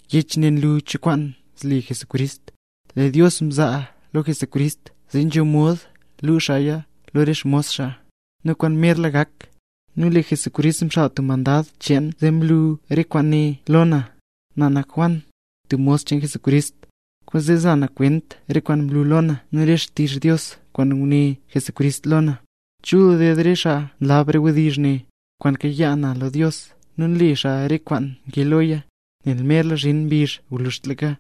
Yech ne nlu cho kwaan zle Jesucrist. Lee Dios mzaa lo Jesucrist zee nzho mod mlu xaaya lo re xmos xaa, re kwaan merla gak. Nu lee Jesucrist mxaal tub mandad cheen zee mlu xaa re kwaane lo na; na nak Juan, tub mos cheen Jesucrist. Kwaanzee nza na kwent re kwaan mlu lo na nu re xtizh Dios kwaan nguné Jesucrist lo na. Chul ded re xaa nlab re wdizh ne, kwaan mkayaa na lo Dios nu nle xaa re kwaan nkee loya, nel merla zhin mbizh gwluzhtlaka.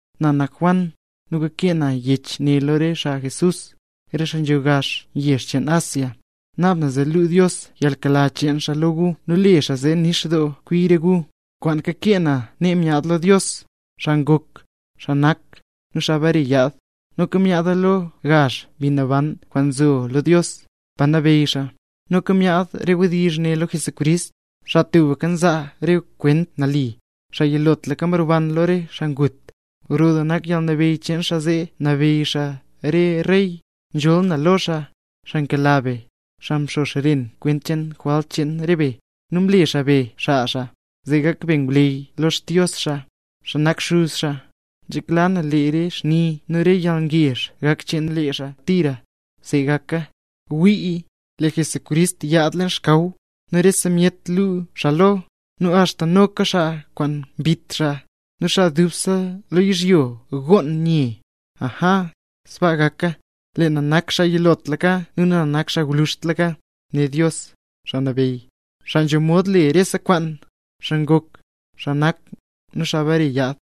Na nak Juan, nu kakee na yech ne lo re xaa Jesús, re xaa nzho gazh yezh cheen Asia. Naab na zee luu Dios yalnkela cheen xaa lo gu nu le xaa zee nix doo kwi re gu. Kwaan kakee na nee myaad lo Dios, xaa ngok, xaa nak, nu xaa bare yaad; noka myaada lo gazh Mbi Naban kwaan nzo lo Dios, pa nabeyy xaa. Nu noka myaad re wdizh ne lo Jesucrist, xaa tubka nzaa re kwent nali, xaa yilotlaka mroban lo re xaa ngut. Gro doo nak yalnabeyy cheen xaa zee nabeyy xaa re rey. Nzholl na lo xaa, xaa nkela be, xaa mxo xren kwent cheen re jwalt cheen re be, nu mle xaa be xaa xaa, zee gak be ngwleyy lo Xdios xaa, xaa nak Xuz xaa. ¡Nzhekla na lee re xni nu re yalngezh gak cheen lee xaa tira! ¡See gaka! ¡Wii! ¡Lee Jesucrist yaad leen xkaw! Nu rese myet luu xaa lo, nu axta noka xaa kwaan mbit xaa; nu xaa dubse lo yizhyo gonn nye. ¡Aja, sbaa gaka! “Lee na nak xaa yilotlaka nu na nak xaa gwluzhtlaka”, né Dios, Xaa Nabeyy, xaa nzho mod le rese kwaan, xaa ngok, xaa nak, nu xaa bare yaad.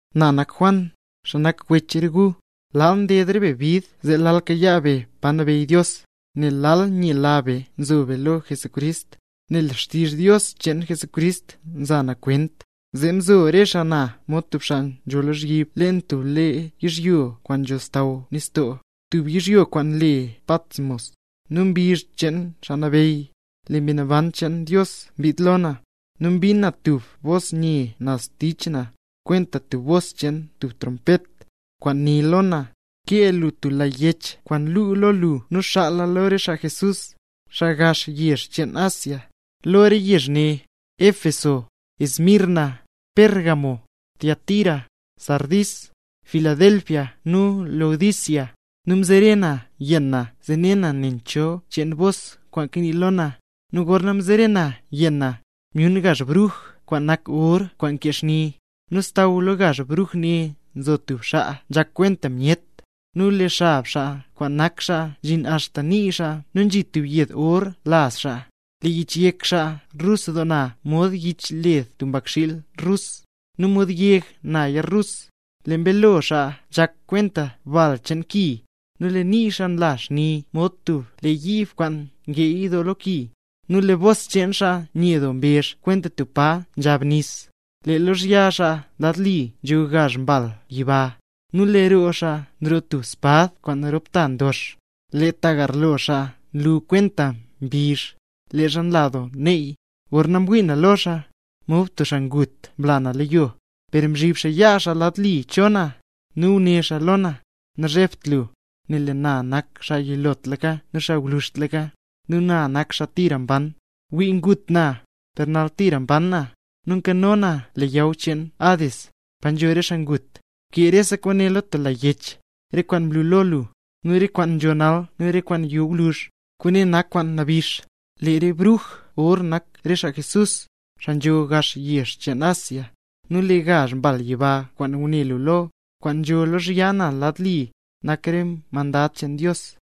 Na nak Juan, xaa nak wech rese gu. Lal nded re be bid zee lal kayaa be pa nabeyy Dios, nel lal nyela be nzo be lo Jesucrist. Nel xtizh Dios cheen Jesucrist nza na kwent, zee mzo re xaa na mod tub xaa nzho lozhyib leen tub lee yizhyo kwaan nzho xsaww nistoo, tub yizhyo kwaan le Patmos. Nu mbizh cheen Xaa Nabeyy, lee Mbi Naban cheen Dios mbid lo na, nu mbin na tub bos nye naz tich na, kwenta tub bos cheen tub trompet, kwaan né lo na: —Bkee lo tub lag yech kwaan lu lo lu nu xaala lo re xaa Jesús, xaa gazh yezh cheen Asia, lo re yezh ne: Éfeso, Esmirna, Pérgamo, Tiatira, Sardis, Filadelfia nu Laodicea. Nu mzere na yenn na zee ne na nen cho cheen bos kwaan kanii lo na; nu gorna mzere na yenn na, myun gazh bruj kwaan nak or kwaan nkee xni, nu xsaww lo gazh bruj ne nzo tub xaa nzhak kwenta myet, nu lee xab xaa kwaan nak xaa nzhin axta nii xaa nu nzhi tub yed or laz xaa. Lee yich yek xaa rus doo na mod yich led tub mbakxiil rus, nu mod yeg naya rus; lee mbeelo xaa nzhak kwenta bal cheen ki. Lee nii xaa nla xni mod tub lee yiib kwaan ngeey doo lo ki, nu lee bos cheen xaa nye doo mbezh kwenta tub pa nzhab nis. Lee lozhya xaa lad li nzho gazh mbal yiba, nu lee roo xaa nroo tub espad kwaan rop ta ndox. Lee ta garlo xaa nlu kwenta mbizh, leezha nla doo neey. Gorna mwii na lo xaa, mod tub xaa ngut mla na lo yo. Per mzhib xaa yaa xaa lad li cho na, nu né xaa lo na: —Nazhebt lu, nel lee na nak xaa yilotlaka nu xaa gwluzhtlaka. Nu na nak xaa tira mban. Gwii, ngut na, per nal tira mban na, nu nkano na leyaw cheen Hades, pa nzho re xaa ngut. Bkee rese kwaane lo tub lag yech: re kwaan mlu lo lu, nu re kwaan nzho nal nu re kwaan yo gwluzh. Kwaane nak kwaan nabix. Lee re bruj or nak re xaa Jesús, xaa nzho gazh yezh cheen Asia, nu lee gazh mbal yiba kwaan ngune lu lo, kwaan nzho lozhya na lad li, nak re mandad cheen Dios.